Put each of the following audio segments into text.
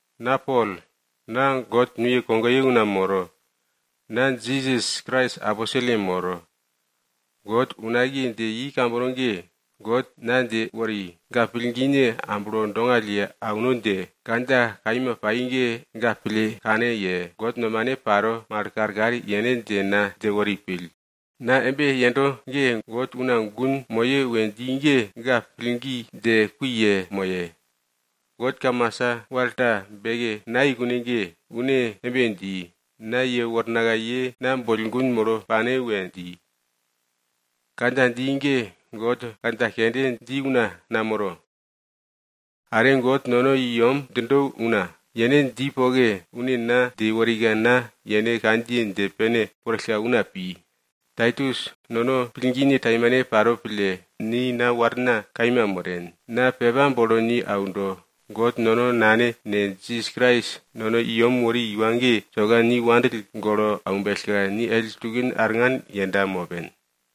Na Pol, na God nuye kogoye una moro, na Jisas Krais aposelye moro. God unakiye dje i kambono ge, God na dje wori, ga pillgine amblo dongall ye auno dje, kandja kaima pai ge, ga pille kane ye, God nomane paro mal karkar yene dje na dje wori pill. Na embe yendo ge, God una gun moye we dji ge, ga pillgi dje kui yemoye. God kamasa, wal ta beke nayei kune ge, une embe dji, na yewornaka ye na boll gun molo pane we dji. Kandja dji ge, God kandja kende dji una namoro. God nono i yem djindo una, yene dji poke, une na dje worika na yene kandjiye dje pene worillka una pi. Taitus, nono pillgine taimane paro pille, ni na warna kaima moren, na pepa bolo ni aundo. God nono Nane ne, Krais Jisas nono i yem wori iwa ge, soka ni wopake pille aumbellka, ni ellin tukin arngan yenda mopen.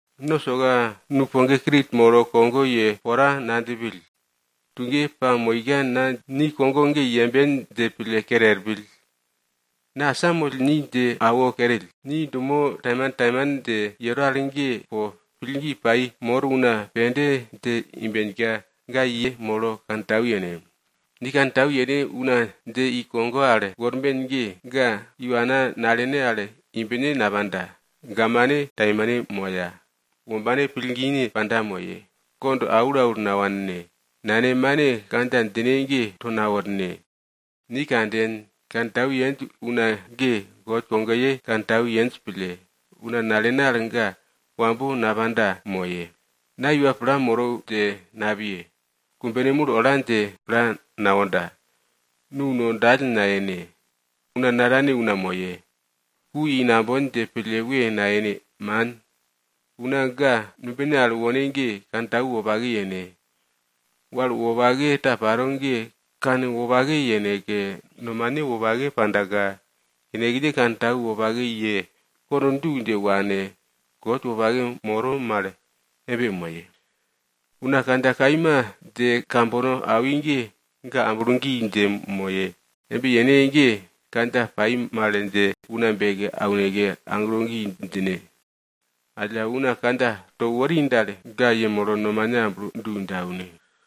No soka nupoge Krit molo kogo ye pora nadjipill, tuge pamoika na ni kogo ge yemben dje pille kere er pill. Na asamoll ni dje awo kerill, ni dumo taimantaiman dje yero al ge po pillgi pai mor una pende dje imbenka, ga yemolo kantau yene. Ni kantau yene una dje i kogo al worben ge, ga iwana nalene al imbne napanda, gamane taimane moya. Wombane pillgine panda moye, kond aulaul nawanne. Nane mane kandja djine ge, to naworne. Ni kanden, kantau yenj una ge, God kogoye kantau yenj pille, una nalene al ga wambo napanda moye. Na iwa pla moro dje napiye. Kumbene mul ola dje pla nawonda. Nu no dall nayene. Una natane una moye. Ku i nambon dje pille we nayene, man. Una ga numbine al wone ge, kantau wopake yene. Wal wopake ta paro ge kanwopake yeneke, nomane wopake pandaka, yenekne kantau wopake ye, kond du dje wane, God wopake moro mal embe moye. Una kandja kaima dje kambono awi ge, ga amblo gi dje moye. Embe yene ge, kandja pai mal dje una beke auneke aglo gi djine. Alla, una kandja to wori dal, ga yemolo nomane amblo du dje aune.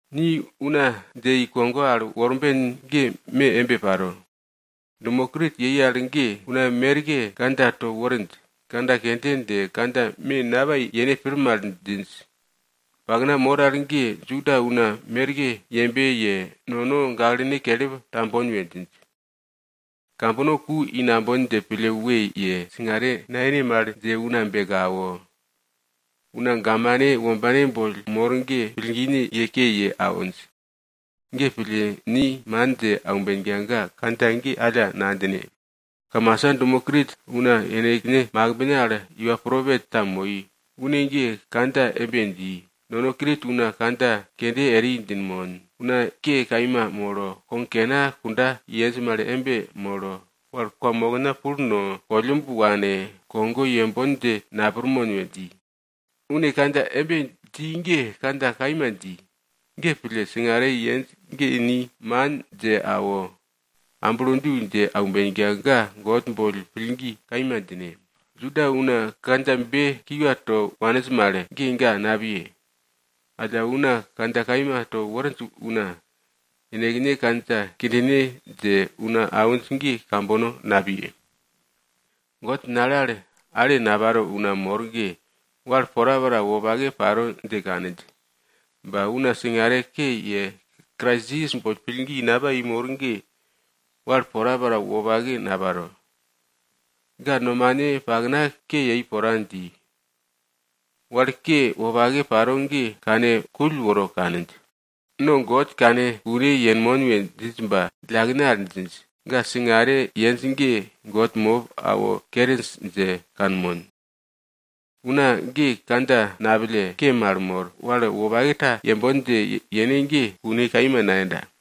Ni una dje i kogo al worben ge me embe paro. Dumo Krit yei al ge, una merke kandja to worinj, kandja kende dje, kandja me napai yene pir mal djinj. Pakna mor al ge Juda una merke yembe ye, nono gaklene kelip tambon we djinj. Kambono ku i nambon dje pille we ye, singare nayene mal dje una beke awo, una gamane wombane boll mor ge, pillgine ye ke ye awinj. Ge pille, ni man dje aumbenka ga kandja ge alla nadjine. Kamasa dumo Krit una yenekne makimbne al iwa propet ta moi. Une ge kandja embe dji, nono Krit una kandja kende eri djinmon. Una ke kaima molo, kog kena kunda yenj mal embe molo, wal kwamokna pul no, kollumb wane, kogo yembon dje napirmon we dji. Une kandja embe dji ge kandja kaima dji. Ge pille, singare yenj ge ni man dje awo, amblo du dje aumbenka, ga God boll pillgi kaima djine. Juda una kandjabe kiwa to waninj mal ge, ga napiye. Alla una kandja kaima to worinj una yenekne kandja kindine dje una awinj ge kambono napiye. God nale al ale naparo una mor ge, wal porapora wopake paro dje kaninj. Ba una singare ke ye, Krais Jisas boll pillgi napai mor ge, wal porapora wopake naparo. Ga nomane pakna ke yei pora dji, wal ke wopake paro ge kane kull woro kaninj. No God kane kune yenmon we djinj ba djillakene al djinj. Ga singare yenj ge God mop awo keri dje kanmon. Una ge kandja napille, ke mal mor, wal wopake ta yembon dje yene ge kune kaima nayenda.